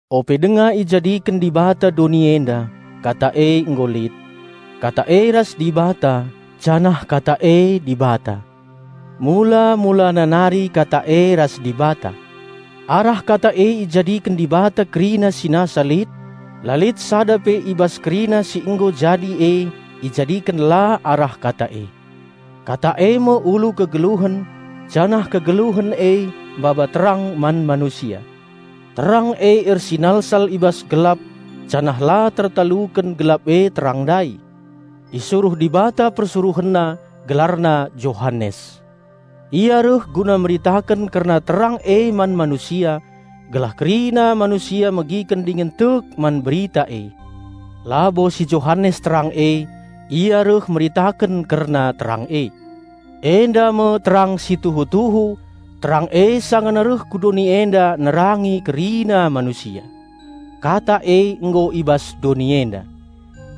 Ope denga ijadiken Dibata doni enda, Kata e nggo lit. Kata e ras Dibata, janah Kata e Dibata. Mula-mulana nari Kata e ras Dibata. Arah Kata e ijadiken Dibata kerina si nasa lit; la lit sada pe i bas kerina si nggo jadi e ijadiken la arah Kata e. Kata e me ulu kegeluhen, janah kegeluhen e maba terang man manusia. Terang e ersinalsal i bas gelap janah la tertaluken gelap e terang ndai. Isuruh Dibata PersuruhenNa, gelarna Johanes. Ia reh guna meritaken kerna terang e man manusia, gelah kerina manusia megiken dingen tek man berita e. Labo si Johanes terang e; ia reh meritaken kerna terang e. Enda me terang si tuhu-tuhu; terang e sangana reh ku doni enda nerangi kerina manusia. Kata e nggo i bas doni enda.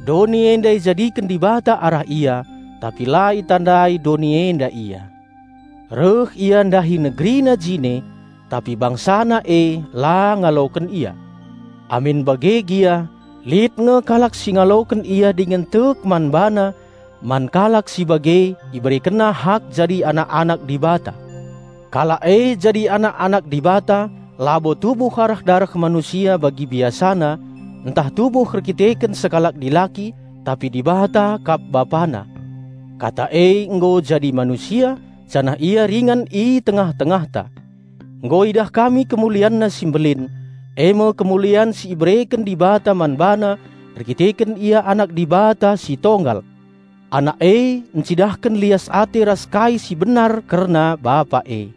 Doni enda ijadiken Dibata arah Ia, tapi la itandai doni enda Ia. Reh Ia ndahi NegeriNa jine, tapi BangsaNa e la ngaloken Ia. Amin bage gia lit nge kalak si ngaloken Ia dingen tek man BaNa; man kalak si bage IberekenNa hak jadi anak-anak Dibata. Kalak e jadi anak-anak Dibata labo tubuh arah dareh manusia bagi biasana, ntah tubuh erdandanken sekalak dilaki, tapi Dibata kap Bapana. Kata e nggo jadi manusia, janah Ia ringan i tengah-tengahta. Nggo idah kami KemulianNa si mbelin, e me kemulian si ibereken Dibata man BaNa erkiteken Ia Anak Dibata si Tonggal. Anak e encidahken lias ate ras kai si benar kerna Bapa e.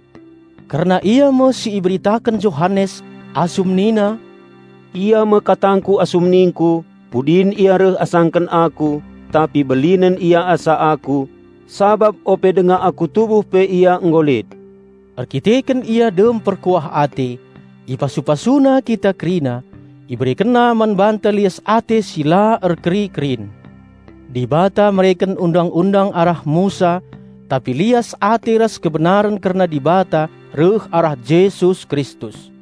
Kerna Ia me si iberitaken Johanes, asum nina, "Ia me katangku asum ningku, 'Pudin Ia reh asangken aku, tapi belinen Ia asa aku, sabap ope denga aku tubuh pe Ia nggo lit.'" Erdandanken Ia dem perkuah ate, ipasu-PasuNa kita kerina, IberekenNa man banta lias ate si la erkeri-kerin. Dibata mereken undang-undang arah Musa tapi lias ate ras kebenaren kerna Dibata reh arah Jesus Kristus.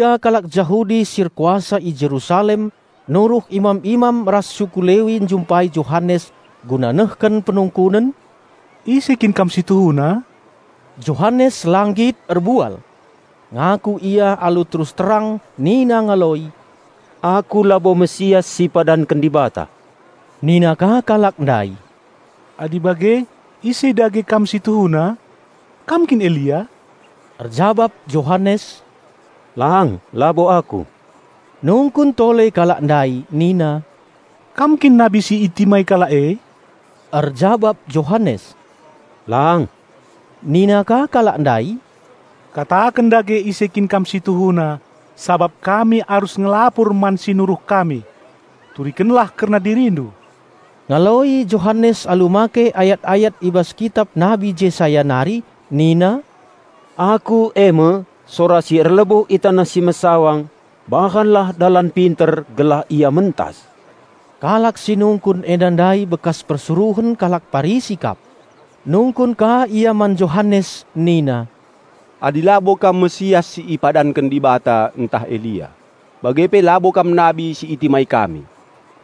Piga-piga kalak Jahudi si erkuasa i Jerusalem nuruh imam-imam ras suku Lewi njumpai Johanes guna nehken penungkunen, "Ise kin kam si tuhuna?" Johanes la nggit erbual. Ngaku ia alu terus terang nina ngaloi, "Aku labo Raja Penampat si ipadanken Dibata." Nina ka kalak ndai, "Adi bage, ise dage kam si tuhuna? Kam kin Elia?" Erjabap Johanes, "Lang, labo aku." Nungkun tole kalak ndai nina, "Kam kin Nabi si itimai kalak e?" Erjabap Johanes, "Lang." Nina ka kalak ndai, "Kataken dage ise kin kam si tuhuna, sabap kami arus ngelapur man si nuruh kami. Turikenlah kerna dirindu." Ngaloi Johanes alu make ayat-ayat i bas kitap Nabi Jesaya nari nina, "Aku e me, 'Sora si erlebuh i taneh si mesawang; bahanlah dalan pinter gelah Ia mentas!'" Kalak si nungkun enda ndai bekas persuruhen kalak Parisi kap. Nungkun ka ia man Johanes nina, "Adi labo kam Raja Penampat si ipadanken Dibata ntah Elia, bage pe labo kam Nabi si itimai kami,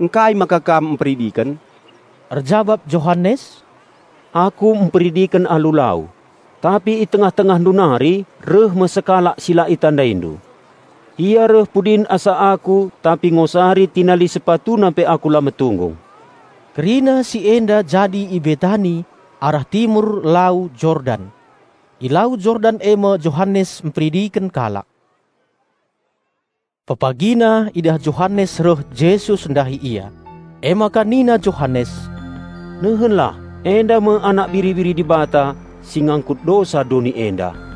ngkai maka kam mperidiken?" Erjabap Johanes, "Aku mperidiken alu lau; tapi i tengah-tengahndu nari reh me Sekalak si la itandaindu. Ia reh pudin asa aku, tapi ngosari tinali SepatuNa pe aku la metunggung." Kerina si enda jadi i Betani, arah timur Lau Jordan. I Lau Jordan e me Johanes mperidiken kalak. Pepagina idah Johanes reh Jesus ndahi ia. Emaka nina Johanes, "Nehenlah, enda me Anak Biri-biri Dibata, si ngangkut dosa doni enda!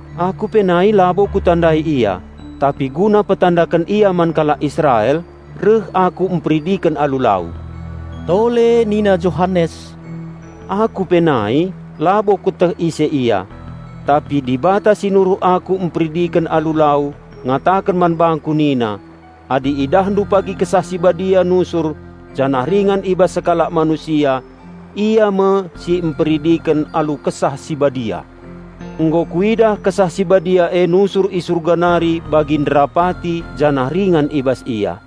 Aku pe nai labo kutandai Ia tapi guna mpetandaken Ia man kalak Israel, reh aku mperidiken alu lau." Tole nina Johanes, "Aku pe nai labo kueteh ise Ia. Tapi Dibata si nuruh aku mperidiken alu lau, ngataken man bangku nina, 'Adi idahndu pagi Kesah Si Badia nusur janah ringan i bas sekalak manusia, Ia me si mperidiken alu Kesah Si Badia.' Nggo kuidah Kesah Si Badia e nusur i Surga nari bagi nderapati janah ringan i bas Ia.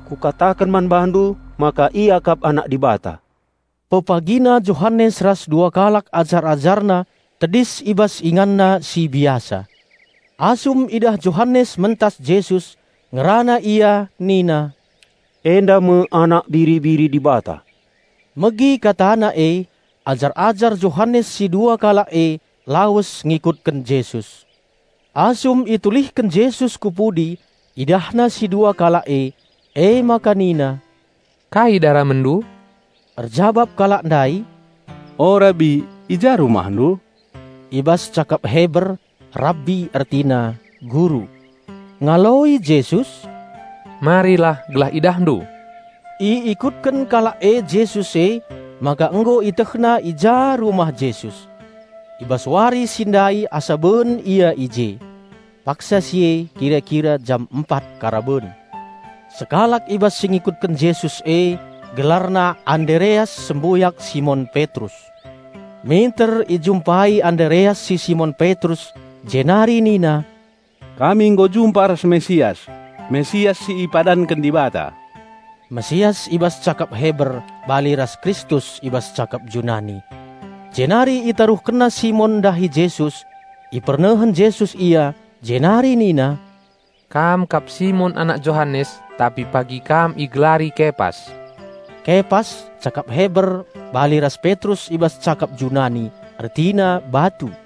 Kukataken man bandu maka Ia kap Anak Dibata." Pepagina Johanes ras dua kalak ajar-ajarna tedis i bas inganna si biasa. Asum idah Johanes mentas Jesus, ngerana ia nina, "Enda me anak Biri-biri Dibata." Megi katana e, ajar-ajar Johanes si dua kalak e lawes ngikutken Jesus. Asum itulihken Jesus ku pudi IdahNa si dua kalak e, emaka nina, "Kai daramenndu?" Erjabap kalak ndai, "O Rabbi, i ja RumahNdu?" (I bas cakap Heber, Rabbi ertina: "Guru".) Ngaloi Jesus, "Marilah gelah IdahNdu." Iikutken kalak e Jesus emaka nggo ietehna i ja rumah Jesus. I bas wari si ndai asa ben ia i je. (Paksa si e kira-kira jam empat karaben.) Sekalak i bas si ngikutken Jesus e gelarna Andereas sembuyak Simon Petrus. Minter ijumpai Andereas si Simon Petrus jenari nina, "Kami nggo jumpa ras Mesias, Raja Penampat si ipadanken Dibata." (Mesias i bas cakap Heber bali ras Kristus i bas cakap Junani.) Jenari itaruhkenna Simon ndahi Jesus. Ipernehen Jesus ia, jenari nina, "Kam kap si Simon anak Johanes, tapi pagi kam igelari Kepas." (Kepas cakap Heber bali ras Petrus i bas cakap Junani; ertina: batu.)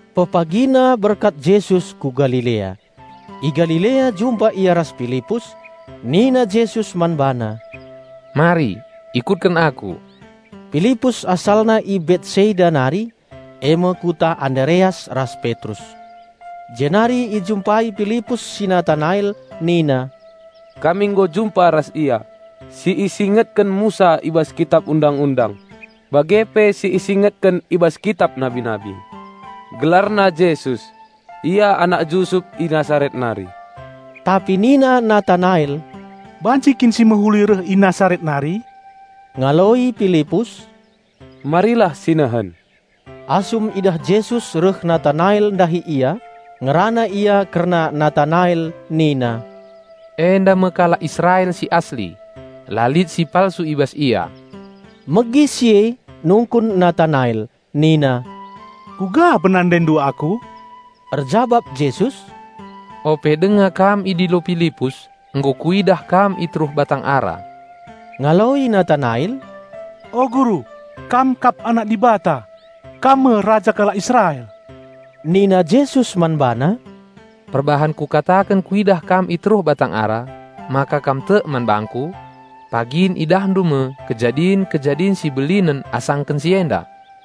Pepagina berkat Jesus ku Galilea. I Galilea jumpa Ia ras Pilipus. Nina Jesus man bana, "Mari, ikutken Aku." (Pilipus asalna i Betsaida nari, e me kuta Andereas ras Petrus.) Jenari ijumpai Pilipus si Natanael nina, "Kami nggo jumpa ras Ia, si isingetken Musa i bas Kitap Undang-undang bage pe si isingetken i bas kitap nabi-nabi. Gelarna Jesus; Ia anak Jusup i Nasaret nari." Tapi nina Natanael, "Banci kin si mehuli reh i Nasaret nari?" Ngaloi Pilipus, "Marilah sinehen." Asum idah Jesus reh Natanael ndahi Ia, ngerana Ia kerna Natanael nina, "Enda me kalak Israel si asli; la lit si palsu i bas ia!" Megi si e nungkun Natanael nina, "Kuga penandaindu aku?" Erjabap Jesus, "Ope denga kam idilo Pilipus, nggo kuidah kam i teruh batang ara." Ngaloi Natanael, "O Guru, Kam kap Anak Dibata! Kam me Raja kalak Israel!" Nina Jesus man bana, "Perbahan Kukataken Kuidah kam i teruh batang ara, maka kam tek man bangKu? Pagin idahndu me kejadin-kejadin si belinen asangken si enda."